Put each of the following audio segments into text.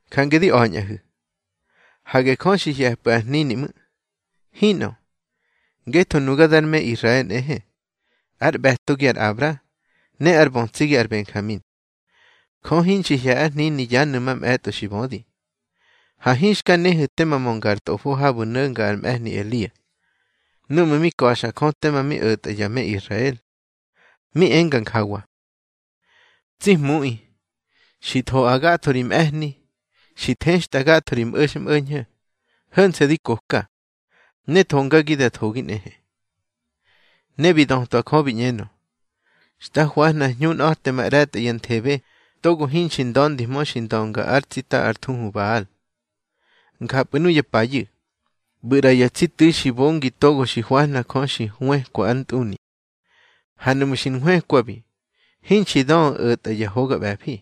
Jange di a̱ñꞌahu̱: Hage Jö xi hye̱pꞌu̱ ár hnini ꞌmu̱. Hinꞌö, ngetho nuga dar me Israel nꞌehe, ár ꞌbe̱togi ar Abra, ne ár bötsigi ar Benjamin. Jö hinxi hye̱ ár hnini yanu̱ mamꞌe̱tꞌo xi bödi. Ha hinxka nehu̱ tema mönga ar Tꞌofo habu̱ no̱nga ar mꞌe̱hni Elia, núꞌmu̱ mi ka̱xa Jö tema mi o̱tꞌa ya me Israel. Mi enga njawa: Tsi Hmuꞌi, xi thoꞌa gatho ri mꞌe̱hni, xi thextꞌa gatho ri ꞌbo̱xmꞌo̱ñho̱. Ho̱nse̱ di koka, ne thongagi da thogi nꞌehe. Ne bi dötwa Jö bi ꞌñenö: Xta hwahna hñunꞌa̱temaꞌre̱tꞌa ya nthebe togo hinxi nda̱ndihmö xi ndönga ar tsita ár thuhu Bal. Njapꞌu̱ nuya payu̱, ꞌbu̱ ꞌra ya tsi tu̱i xi bongi togo xi hwahna Jö xi hwëkwa ár ntꞌuni. Ha nuꞌmu̱ xi nhwëkwabi, hinxi döꞌu̱ o̱tꞌa ya hoga ꞌbe̱fi.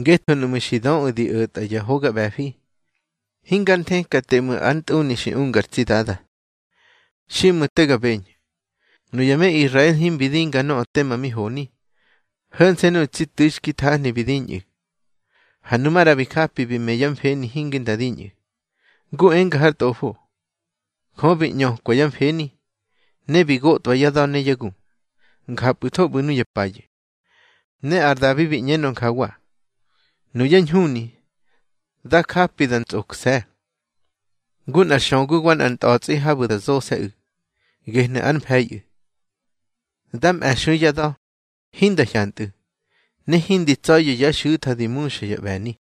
Ngetho nuꞌmu̱ xi döꞌu̱ di o̱tꞌa ya hoga ꞌbe̱fi, hingar nthekate ꞌmu̱ ár ntꞌuni xi unga ar tsi Dada. Xiꞌmu̱, te ga beñhu̱. Nuya me Israel himbi dinga nöꞌö tema mi honi. Ho̱nse̱ nuꞌu̱ tsi tu̱i xki thahni bi diñꞌu̱. Ha nu maꞌra bi njapi bi me yá mfeni hinge nda diñꞌu̱. Ngu enga har Tꞌofo: Jö bi ꞌñökwa yá mfeni, ne bi gotwa yá da̱ ne yá gu. Njapꞌu̱tho ꞌbu̱ nuya payu̱. Ne ar Dabi bi ꞌñenö njawa: Nuyá ñhuni, dá japi da ntsꞌokse̱, ngu nꞌar xögu wa nꞌar ntꞌa̱tsꞌi habu̱ da zose̱ꞌu̱, gehnu̱ ár mfe̱iꞌu̱. Dá mꞌe̱xui yá da̱, hinda hyantꞌu̱, ne hindi tsa̱ya̱ yá xu̱tha di muxa yá ꞌbe̱ni.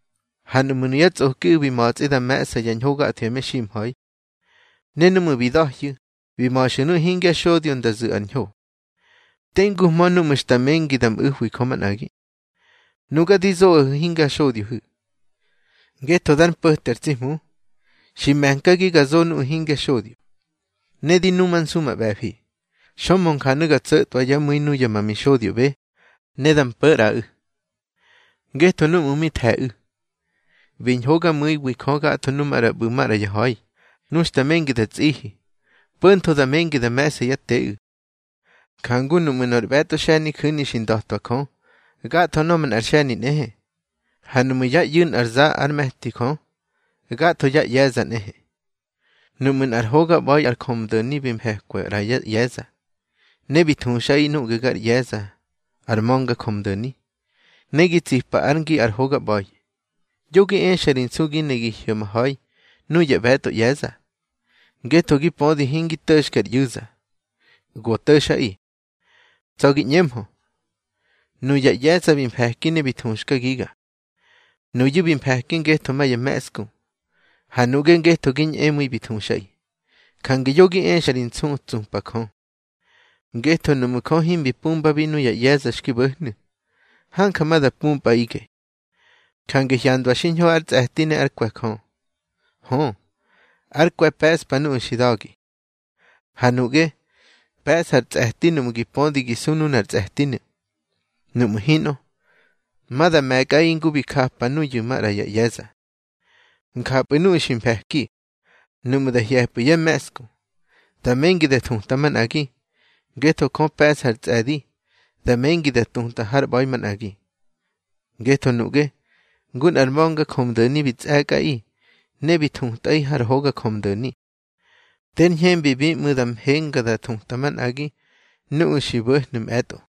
Ha nuꞌmu̱ nuyá tsꞌokiꞌu̱ bi ma̱tsꞌi da me̱ꞌsa ya ñho gatho ya meximha̱i, ne núꞌmu̱ bi da̱hyu̱ bi ma̱xa nuꞌu̱ hingya xodyo nda zu̱ ar ñho, tenguhmö núꞌmu̱ xta mengi da mꞌu̱hwi Jö manꞌagi. Nuga di zoꞌahu̱ hingar xodyohu̱, ngetho dar mpo̱te ar tsi Hmu, xi me̱nkagi ga zo nuꞌu̱ hingya xodyo, ne di numansu ma ꞌbe̱fi. Xömhö njanu̱ ga tso̱tꞌwa yá mu̱i nuya ma mixodyoꞌbe, ne da mpo̱ ꞌraꞌu̱. Ngetho núꞌmu̱ mi the̱ꞌu̱, bi ñhogamu̱iwi Jö gatho nu maꞌra ꞌbu̱ maꞌra ya ha̱i, nu xta mengi da tsꞌihi, po̱ntho da mengi da me̱ꞌsa yá teꞌu̱. Njangu nuꞌmu̱ nor ꞌbe̱tꞌo xe̱niju̱ni xi nda̱twa Jö, gatho nöꞌö manꞌa xe̱ni nꞌehe. Ha nuꞌmu̱ yá ꞌyu̱ nꞌar za ár me̱ti Jö, gatho yá ꞌye̱za nꞌehe. Nuꞌmu̱ nꞌar hoga ꞌba̱i ar njömdo̱ni bi mfe̱kwa ꞌra yá ꞌye̱za, ne bi thuxꞌaꞌi nuꞌge gar ꞌye̱za ar ma̱nga njömdo̱ni, ne gi tsipa ár ngi ar hoga ꞌba̱i, yo gi exa ri nsu gi ne gi hyo̱maha̱i nuya ꞌbe̱tꞌo ꞌye̱za. Ngetho gi pödi hingi to̱xke ar ꞌyu̱za, go to̱xꞌaꞌi. Tsa̱ gi ꞌñemhö: Nuya ꞌye̱za bi mfe̱ki ne bi thuxkagiga. Nuyu̱ bi mfe̱ki ngetho ma ya me̱ꞌsku, ha nuꞌge ngetho gi ñꞌemu̱i bi thuxꞌaꞌi. Jange yo gi exa ri nsu, tsupa Jö. Ngetho nuꞌmu̱ Jö himbi pumbabi nuya ꞌye̱za xki bo̱hnu̱, hanja ma da pumpꞌaꞌige. Jange hyandwa xiñho ár tsꞌe̱ti ne ár kwe̱ Jö. Hö, ár kwe̱ pe̱ꞌspa nuꞌu̱ xi da̱gi. Ha nuꞌge, pe̱sꞌa ar tsꞌe̱ti nuꞌmu̱ gi pödi gi su nunar tsꞌe̱tinu̱. Nuꞌmu̱ hinꞌö, ma da me̱kꞌaꞌi ngu bi japa nuyu̱ maꞌra ya ꞌye̱za. Njapꞌu̱ nuꞌu̱ xi mfe̱ki, nuꞌmu̱ da hye̱pꞌu̱ yá me̱ꞌsku, da mengi da thuta manꞌagi, ngetho Jö pe̱ꞌsa ar tsꞌe̱di da mengi da tuta har ꞌba̱i manꞌagi. Ngetho nuꞌge, ngu nꞌar ma̱nga njömdo̱ni bi tsꞌe̱kꞌaꞌi ne bi thutꞌaꞌi har hoga njömdo̱ni, ter ñhembibi ꞌmu̱ da mhenga da thuta manꞌagi nuꞌu̱ xki bo̱hnu̱ mꞌe̱tꞌo.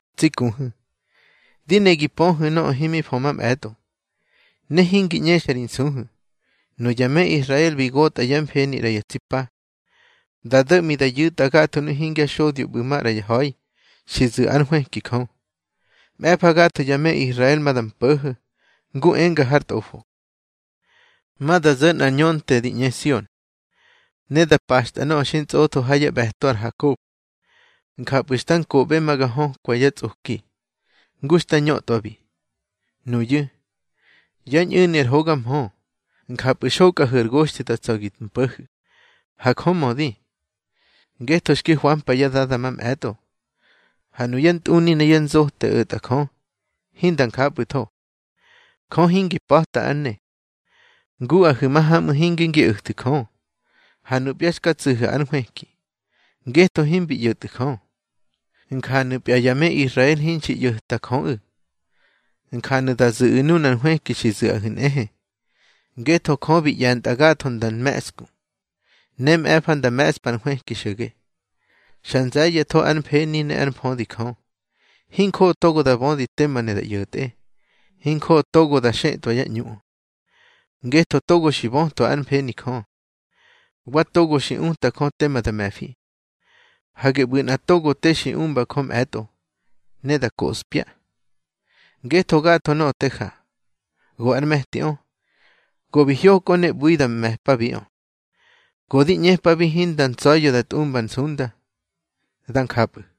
Tsi kuhu̱, di ne gi pöhu̱ nöꞌö himi fö mamꞌe̱tꞌo, ne hingi ꞌñexa ri nsuhu̱: Nuya me Israel bi gotꞌa yá mfeni ꞌra ya tsi pa, da do̱ꞌmi da yu̱tꞌa gatho nuꞌu̱ hingya xodyo ꞌbu̱ maꞌra ya ha̱i xi zu̱ ár nhwëki Jö. Mꞌe̱fa gatho ya me Israel ma da mpo̱ho̱, ngu enga har Tꞌofo: Ma da zo̱ nꞌar ñönte di ꞌñe Sion, ne da paxtꞌa nöꞌö xi ntsꞌotho ha yá ꞌbe̱to ar Hakob. Njapꞌu̱ xta nkoꞌbe ma ga hökwa yá tsꞌoki, ngu xta ñötꞌwabi. Nuyu̱, yá ñꞌu̱ni ar hoga mhö, njapu̱ xokꞌahu̱ ar goxthi da tsa̱ gi mpo̱hu̱. Ha Jö mödi, ngetho xki hwampa yá dada mamꞌe̱tꞌo. Ha nuyá ntꞌuni ne yá nzote o̱tꞌa Jö, hinda njapꞌu̱tho. Jö hingi pa̱ta ár ne. Nguꞌahu̱ mahamꞌu̱ hinge ngi o̱thu̱ Jö, ha nupya xka tsu̱hu̱ ár nhwëki, ngetho himbi ꞌyo̱tꞌu̱ Jö. Njanu̱pya ya me Israel hinxi ꞌyo̱ta Jöꞌu̱, njanu̱ da zu̱ꞌu̱ nunar nhwëki xi zu̱ꞌahu̱ nꞌehe. Ngetho Jö bi ꞌye̱ntꞌa gatho nda nme̱ꞌsku, ne mꞌe̱fa nda me̱ꞌspa ar nhwëki xo̱ge. Xa nze̱ye̱tho ár mfeni ne ár mfödi Jö. Hinjoꞌo togo da bödi tema ne da ꞌyo̱tꞌe. Hinjoꞌo togo da xetꞌwa yá ꞌñuꞌö. Ngetho, togo xi bötwa ár mfeni Jö, wa togo xi uta Jö tema da me̱fi. Hage ꞌbu̱ nꞌa togo te xi umba Jö mꞌe̱tꞌo, ne da koꞌspya. Ngetho gatho nöꞌö te ja, go ár me̱tiꞌö, go bi hyokꞌö ne ꞌbu̱i da me̱pabiꞌö. Go di ꞌñepabi hinda ntsa̱ya̱ da tꞌumba ar nsunda. Dá njapꞌu̱.